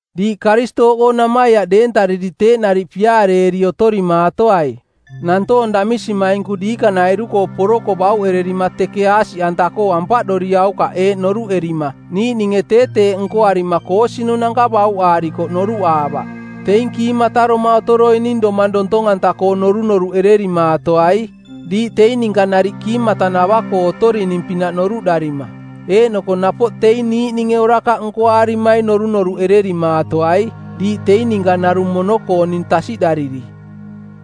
Diiꞌ Karistooꞌkoo namaiaꞌ deentariri teeꞌ nariꞌ piaareeri otorimaatoai. Nantoong damisimainku diikanairu-koo poroko bauꞌererima teke aasiꞌanta-koo ampaꞌdoriaukaꞌ eeꞌ noruꞌerima niiꞌninge tee teeꞌ nkoarima koosinunanka bauꞌaarikoꞌ noruꞌaavaꞌ. Teing kiimataroma otoroining domang dontong-anta-koo norunoruꞌererimaatoai, diiꞌ teing ninka nariꞌ kiimatanavaꞌkoo otorining-pinaꞌ noruꞌdarima. Eeꞌnoko napoꞌ teing niiꞌninge orakaꞌ nkoaarimaing norunoruꞌererimaatoai, diiꞌ teing ninka narung mono-kooning tasiꞌdariri.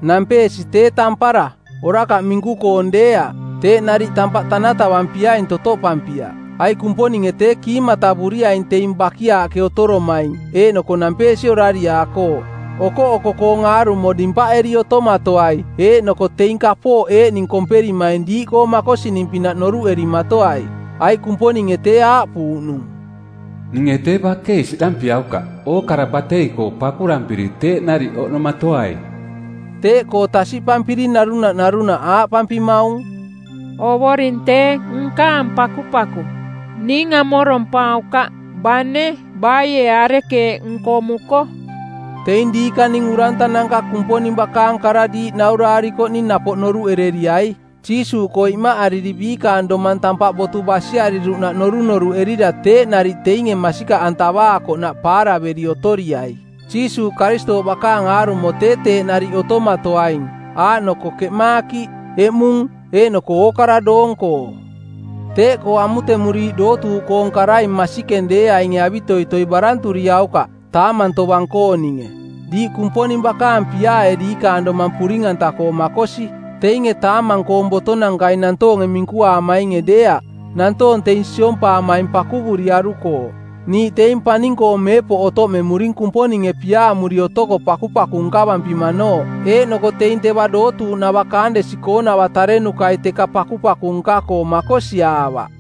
Nampeesi tee tampara, orakaꞌ minku-koong deeaꞌ. Teeꞌ nariꞌ tampaꞌ tanatavampiaing totoꞌpampiaꞌ, aiꞌ Kumponinge tee kiimatavuriaing teing bakiaaꞌke otoromaing eeꞌnoko nampeesi orariaakooꞌ. Okoꞌoko-koong aarumo dimpaꞌeri otomatoai eeꞌnoko teing kapooꞌ eeꞌning komperimaing diiꞌkoo makosining-pinaꞌ noruꞌerimatoai, aiꞌ Kumponinge tee aaꞌpuuꞌnung, “Ninge tee bakei siꞌdampiaukaꞌ. Ookara batei-koo pakurampiri teeꞌ nariꞌ oꞌnomatoaing.” Teeꞌkoo tasiꞌpampiri narunaꞌ narunaꞌ aaꞌpampimaung, “Ovoring tee nkaang pakupaku, ning amorompaukaꞌ, bane baie arekeeꞌ nkomuko.” Teing diikaning urantananka Kumponing bakaang kara diiꞌ nauraarikoꞌning napoꞌ noruꞌereriai. Jiisuuꞌkoo imaꞌariri biikaang domang tampaꞌ botu basiariruꞌnaꞌ norunoruꞌerira teeꞌ nariꞌ teinge masikaꞌantavaakoꞌnaꞌ paaraveri otoriai. Jiisuuꞌ Karistooꞌ bakaang aarumo tee teeꞌ nariꞌ otomatoaing, aaꞌnoko keꞌmaakiꞌ, eꞌmung, eeꞌnoko ookara doong-koo. Teeꞌkoo amutemuriiꞌ dootuuꞌkoong karai masikeng deeainge avitoitoi baranturiaukaꞌ, taamang tovang-kooninge. Diiꞌ Kumponing bakaang piaae diikaang domang puring-anta-koo makosi, teinge taamang-koong botonankai nantoonge minkuaamainge deeaꞌ. Nantoong teing siompaamaing pakuvuriarukooꞌ. Niiꞌ teing paning-koo meepoꞌ otoꞌmemuring Kumponinge piaamuri otoko pakupaku nkavampimanooꞌ eeꞌnoko teing teva dootuuꞌnava kaandesi-koonava tarenukai teka pakupaku nka-koo makosiaavaꞌ.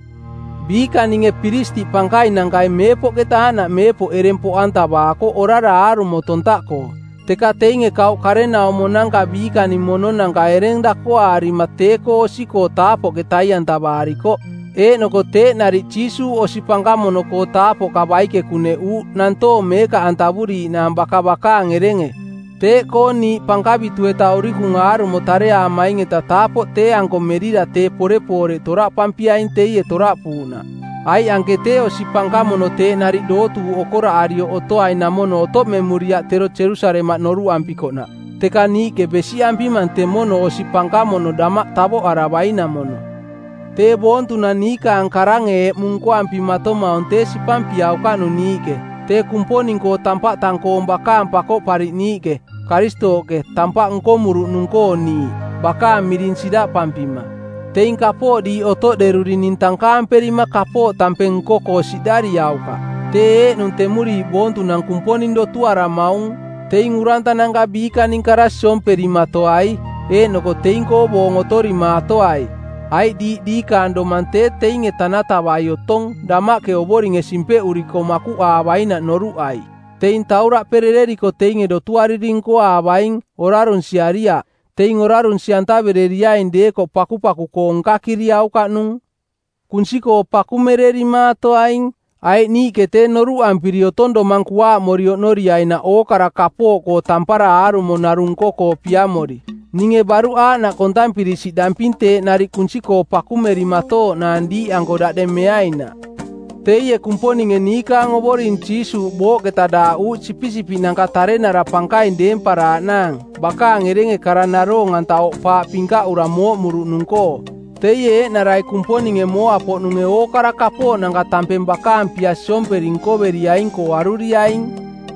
Biikaninge piristiꞌ pankainankai Meepoꞌketa Aaꞌnaꞌ Meepoꞌ ereng poꞌantavaakoꞌ orara aarumo tontaꞌkoo, teka teinge kauꞌ karenaumonanka biikaning mononanka ereng dakoaarima tee-koo osi-koo taapoꞌke tai-antavaarikoꞌ. Eeꞌnoko teeꞌ nariꞌ Jiisuuꞌ osi pankamono-koo taapoꞌka baike kuneꞌuuꞌ nantoong meekaꞌantavuriiꞌnaang baka bakaang erenge. Teeꞌkoo niiꞌ pankavitu-eta urikung aarumo tareaamaing-eta taapoꞌ tee-anko merira tee porepooreꞌ toraꞌpampiaing teie toraꞌpuuꞌnaꞌ. Aiꞌ anke tee osi pankamono teeꞌ nariꞌ dootuuꞌ okoraꞌarioꞌ otoainamono otoꞌmemuriaꞌ tero Jerusalemaꞌ noruꞌampikoꞌnaꞌ, teka niiꞌke besiꞌampimang temono osi pankamono damaꞌ tavoꞌaravainamono. Tee boontunang niikaang karange eꞌmung nkoampimatomaung tee sipampiaukaꞌnung niiꞌke, tee Kumponing-koo tampaꞌ tang-koong bakaang Pakoꞌpariꞌniiꞌke, Karistooꞌke, tampaꞌ nkomuruꞌnung-koo niiꞌ, bakaang miring siraꞌpampima. Teing kapooꞌ diiꞌ otoꞌderurining tankaamperima kapooꞌ tampeng nko-koo siꞌdariaukaꞌ. Tee eeꞌnung temuriiꞌ boontunang Kumponing dotuaramaung. Teing urantananka biikaning kara siomperimatoai eeꞌnoko teing-koo boong otorimaatoai, aiꞌ diiꞌ diikaang domang tee teinge tanatavai otong damaꞌke Ovoringe simpeꞌuriko makuꞌaavainaꞌ noruꞌai. Teing tauraꞌperereriko teinge dotuariri nkoaavaing, orarunsiariaꞌ. Teing orarunsi-antavereriaing deekoꞌ pakupaku-koo nkakiriaukaꞌnung. Kunsi-koo pakumererimaatoaing, aiꞌ niiꞌke tee noruꞌampiri otong domang kuaaꞌmori oꞌnorinaꞌ ookara kapooꞌkoo tampara aarumo narung nko-koo piamori. Ninge baruꞌ aaꞌnaꞌ kontampiri siꞌdamping teeꞌ nariꞌ kunsi-koo pakumerimatooꞌnaang diiꞌanko daꞌdeng meainaꞌ. Teie Kumponinge niikaang Ovoring Jiisuuꞌ booꞌketa daaꞌuuꞌ sipisipiꞌnanka tarenara pankaing deemparaaꞌnaang bakaang erenge kara naroong-anta oꞌpaaꞌ pinkaꞌura mooꞌmuruꞌnung-koo; Teie eeꞌnarai Kumponinge mooa-poꞌnunge ookara kapooꞌnanka tampeng bakaang pia siomperi nkoveriaing-koo aruriaing.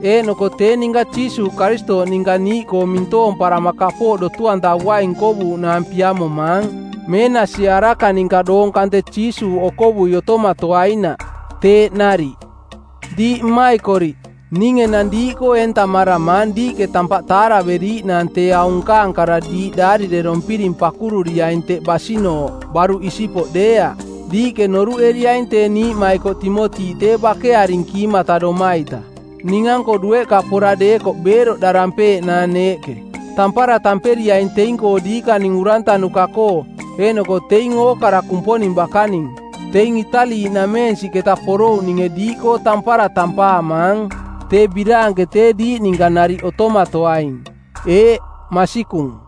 Eeꞌnoko tee ninka Jiisuuꞌ Karistooꞌ ninka niiꞌkoo mintoomparama kapooꞌ dotu-antavuaing nkovuuꞌnaang piamomaang meenasie araka ninka doong kante Jiisuuꞌ okovui otomatoainaꞌ. Teeꞌ nariꞌ. Diiꞌ mmaikoriꞌ, ning enang diiꞌkoo eentamaramaang diiꞌke tampaꞌ taaraveriiꞌnaang tee aung nkaang kara diiꞌ daarirerompiring pakururiaing teꞌ basinooꞌ baruꞌ isipoꞌ deeaꞌ. Diiꞌke noruꞌeriaing tee niiꞌmaikoꞌ Timoti tee bakearing kiimata-doma-ita. Ning-anko dueꞌka pora deekoꞌ beeroꞌdarampeeꞌnaang neeꞌke. Tampara tamperiaing teing-koo diikaning urantanuka-koo, eeꞌnoko teing ookara Kumponing bakaning. Teing Itali-nameensiꞌketa porouꞌninge diiꞌkoo tampara tampaamaang. Tee biraanke tee diiꞌ ninka nariꞌ otomatoaing. Eeꞌ, masikung.